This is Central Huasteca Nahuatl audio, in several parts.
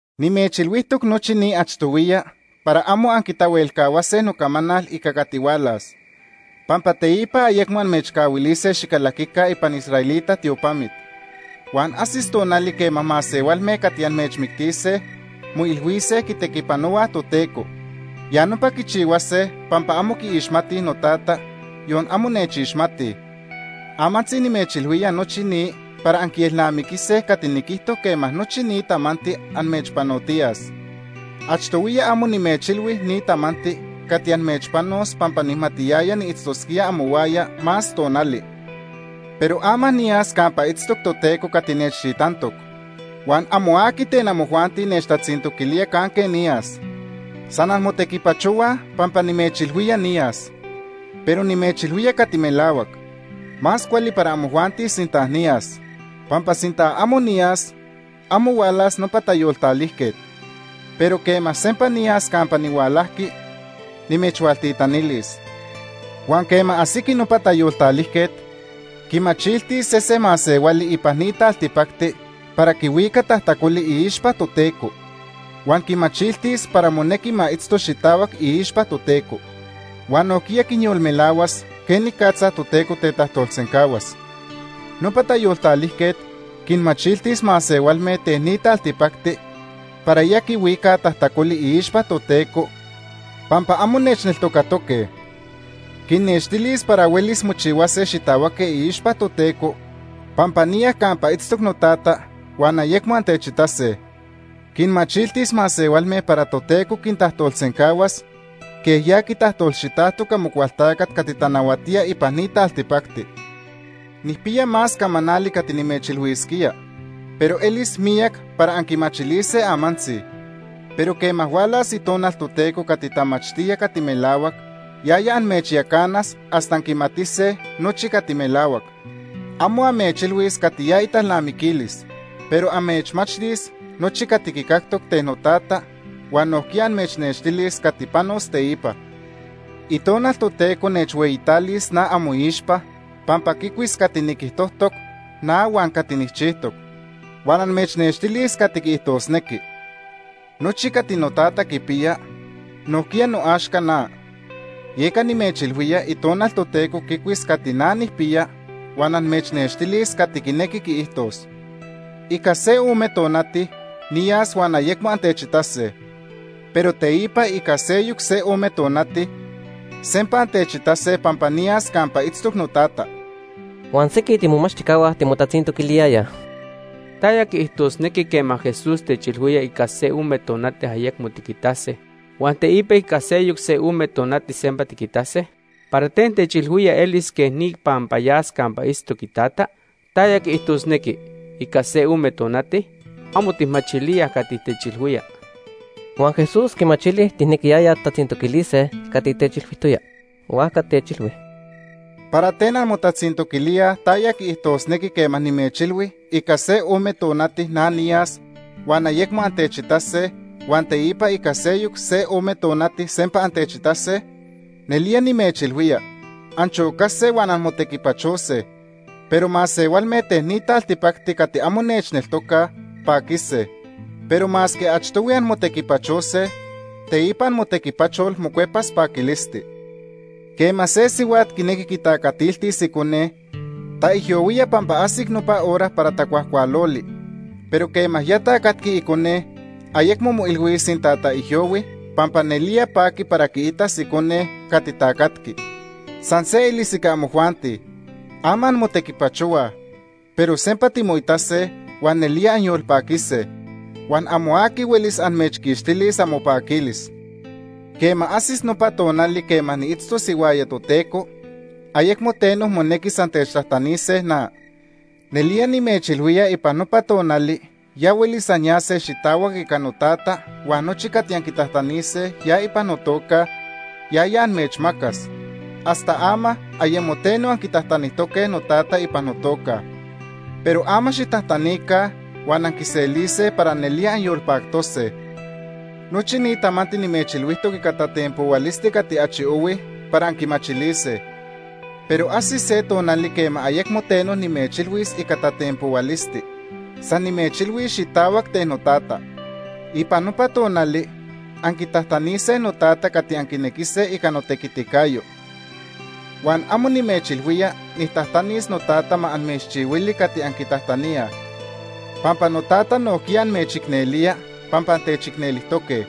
“Nimechilhuijtoc nochi ni achtohuiya para amo anquitahuelcahuase nocamanal ica cati hualas. Pampa teipa ayecmo amechcahuilise xicalaquica ipan israelita tiopamit. Huan ajsis tonali quema masehualme cati amechmictise moilhuise quitequipanohuaj Toteco. Ya nopa quichihuase pampa amo quiixmatij noTata, yon amo nechixmatij. Amantzi nimechilhuía nochi ni para anquielnamiquise cati niquijto quema nochi ni tamanti amechpanotiyas. Itequi Itonal Toteco “Achtohuiya amo nimechilhui ni tamanti cati amechpanos pampa nijmatiyaya niitztosquía amohuaya más tonali. Pero ama niyas campa itztoc Toteco cati nechtitantoc. Huan amo aqui ten amojuanti nechtatzintoquilía canque niyas. San anmotequipachohuaj pampa nimechilhuía niyas. Pero nimechilhuía cati melahuac. Más cuali para amojuanti sinta niyas. Pampa sinta amo niyas, amo hualas nopa Tayoltalijquet. Pero quema sempa niyas campa nihualajqui, nimechhualtitanilis. Huan quema ajsiqui nopa Tayoltalijquet, quimachiltis sesen masehuali ipan ni taltipacti para quihuica tajtacoli iixpa Toteco, huan quimachiltis para monequi ma itzto xitahuac iixpa Toteco. Huan nojquiya quinyolmelahuas quenicatza Toteco tetajtolsencahuas. Nopa Tayoltalijquet quinmachiltis masehualme ten ni taltipacti para ya quihuicaj tajtacoli iixpa Toteco pampa amo nechneltocatoque. Quinnextilis para huelis mochihuase xitahuaque iixpa Toteco pampa niya campa itztoc noTata huan ayecmo antechitase. Quinmachiltis masehualme para Toteco quintajtolsencahuas quej ya quitajtolxitajtoc Amocualtacat cati tanahuatía ipan ni taltipacti. “Nijpiya más camanali cati nimechilhuisquía, pero elis miyac para anquimachilise amantzi. Pero quema hualas Itonal Toteco cati tamachtía cati melahuac, yaya amechyacanas hasta anquimatise nochi cati melahuac. Amo amechilhuis cati ya italnamiquilis, pero amechmachtis nochi cati quicactoc ten noTata, huan nojquiya amechnextilis cati panos teipa. Itonal Toteco nechhueyitalis na amoixpa pampa quicuis cati niquijtojtoc na huan cati nijchijtoc, huan amechnextilis cati quiijtosnequi. Nochi cati noTata quipiya, nojquiya noaxca na. Yeca nimechilhuía Itonal Toteco quicuis cati na nijpiya huan amechnextilis cati quinequi quiijtos. “Ica se ome tonati niyas huan ayecmo antechitase. Pero teipa ica seyoc se ome tonati, sempa antechitase pampa niyas campa itztoc noTata.” Huan sequij tiimomachtijcahua timotatzintoquiliyayaj: ―¿Taya quiijtosnequi quema Jesús techilhuía ica se ome tonati ayecmo tiquitase, huan teipa ica seyoc se ome tonati sempa tiquitase? ¿Para ten techilhuía elis quej ni pampa yas campa itztoc iTata? ¿Taya quiijtosnequi ‘ica se ome tonati’? Amo tijmachilíaj cati techilhuía. Huan Jesús quimachili tijnequiyayaj tijtatzintoquilise cati techilhuijtoya, huajca techilhui: ―¿Para ten anmotatzintoquilíaj taya quiijtosnequi quema nimechilhui ica se ome tonati na niyas huan ayecmo antechitase, huan teipa ica seyoc se ome tonati sempa antechitase? Nelía nimechilhuía anchocase huan anmotequipachose, pero masehualme ten ni taltipacti cati amo nechneltocaj, paquise. Pero masque achtohui anmotequipachose, teipa amotequipachol mocuepas paquilisti. Quema se sihuat quinequi quitacatiltis icone, taijyohuía pampa ajsic nopa hora para tacuajcualoli, pero quema ya tacatqui icone, ayecmo moilhuis sinta taijyohui pampa nelía paqui para quiitas icone cati tacatqui. San se elis ica amojuanti. Ama anmotequipachohuaj, pero sempa timoitase huan nelía anyolpaquise, huan amo aqui huelis amechquixtilis amopaquilis. “Quema ajsis nopa tonali quema niitztos ihuaya Toteco, ayecmo teno monequis antechtajtanise na. Nelía nimechilhuía ipan nopa tonali ya huelis anyase xitahuac ica noTata huan nochi cati anquitajtanise ya ipan notoca Ica notequiticayo., yaya amechmacas. Hasta ama ayemo teno anquitajtanijtoque noTata ipan notoca Ica notequiticayo.. Pero ama xijtajtanica huan anquiselise para nelía anyolpactose. “Nochi ni tamanti nimechilhuijtoc ica tatenpohuilisti cati achi ohui para anquimachilise, pero ajsis se tonali quema ayecmo teno nimechilhuis ica tatenpohuilisti, san nimechilhuis xitahuac ten noTata. Ipan nopa tonali anquitajtanise noTata cati anquinequise ica notequiticayo. Huan amo nimechilhuía nijtajtanis noTata ma amechchihuili cati anquitajtaníaj, pampa noTata nojquiya amechicnelía pampa antechicnelijtoque.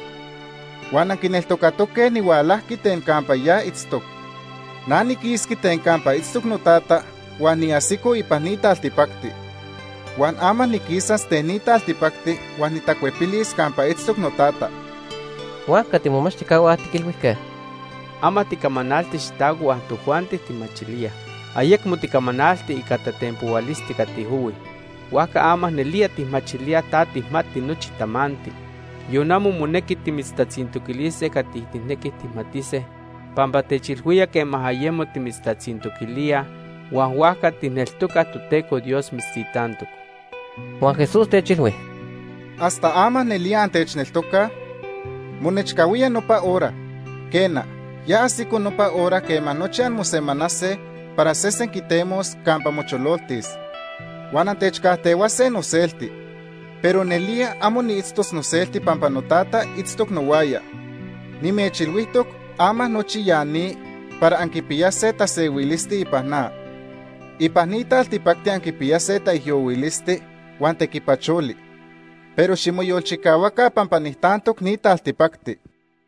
Huan anquineltocatoque nihualajqui ten campa ya itztoc. Na niquisqui ten campa itztoc noTata huan niajsico ipan ni taltipacti. Huan ama niquisas ten ni taltipacti huan nitacuepilis campa itztoc noTata.” Huajca tiimomachtijcahua tiquilhuijque: ―Ama ticamanalti xitahuac huan tojuanti tijmachilíaj. Ayecmo ticamanalti ica tatenpohuilisti cati ohui. Huajca ama nelía tijmachilíaj ta tijmati nochi tamanti. Yon amo monequi timitztatzintoquilise cati tijnequij tijmatise pampa techilhuía quema ayemo timitztatzintoquilíaj, huan huajca tijneltocaj Toteco Dios mitztitantoc. Huan Jesús techilhui: ―¿Hasta ama nelía antechneltocaj? Monechcahuía nopa hora, quena, ya ajsico nopa hora quema nochi anmosemanase para sesen quitemos campa mochololtis. Huan antechcajtehuase noselti. Pero nelía amo niitztos noselti pampa noTata itztoc nohuaya. Nimechilhuijtoc ama nochi ya ni para anquipiyase tasehuilisti ipan na. Ipan ni taltipacti anquipiyase taijyohuilisti huan tequipacholi, pero ximoyolchicahuaca pampa nijtantoc ni taltipacti.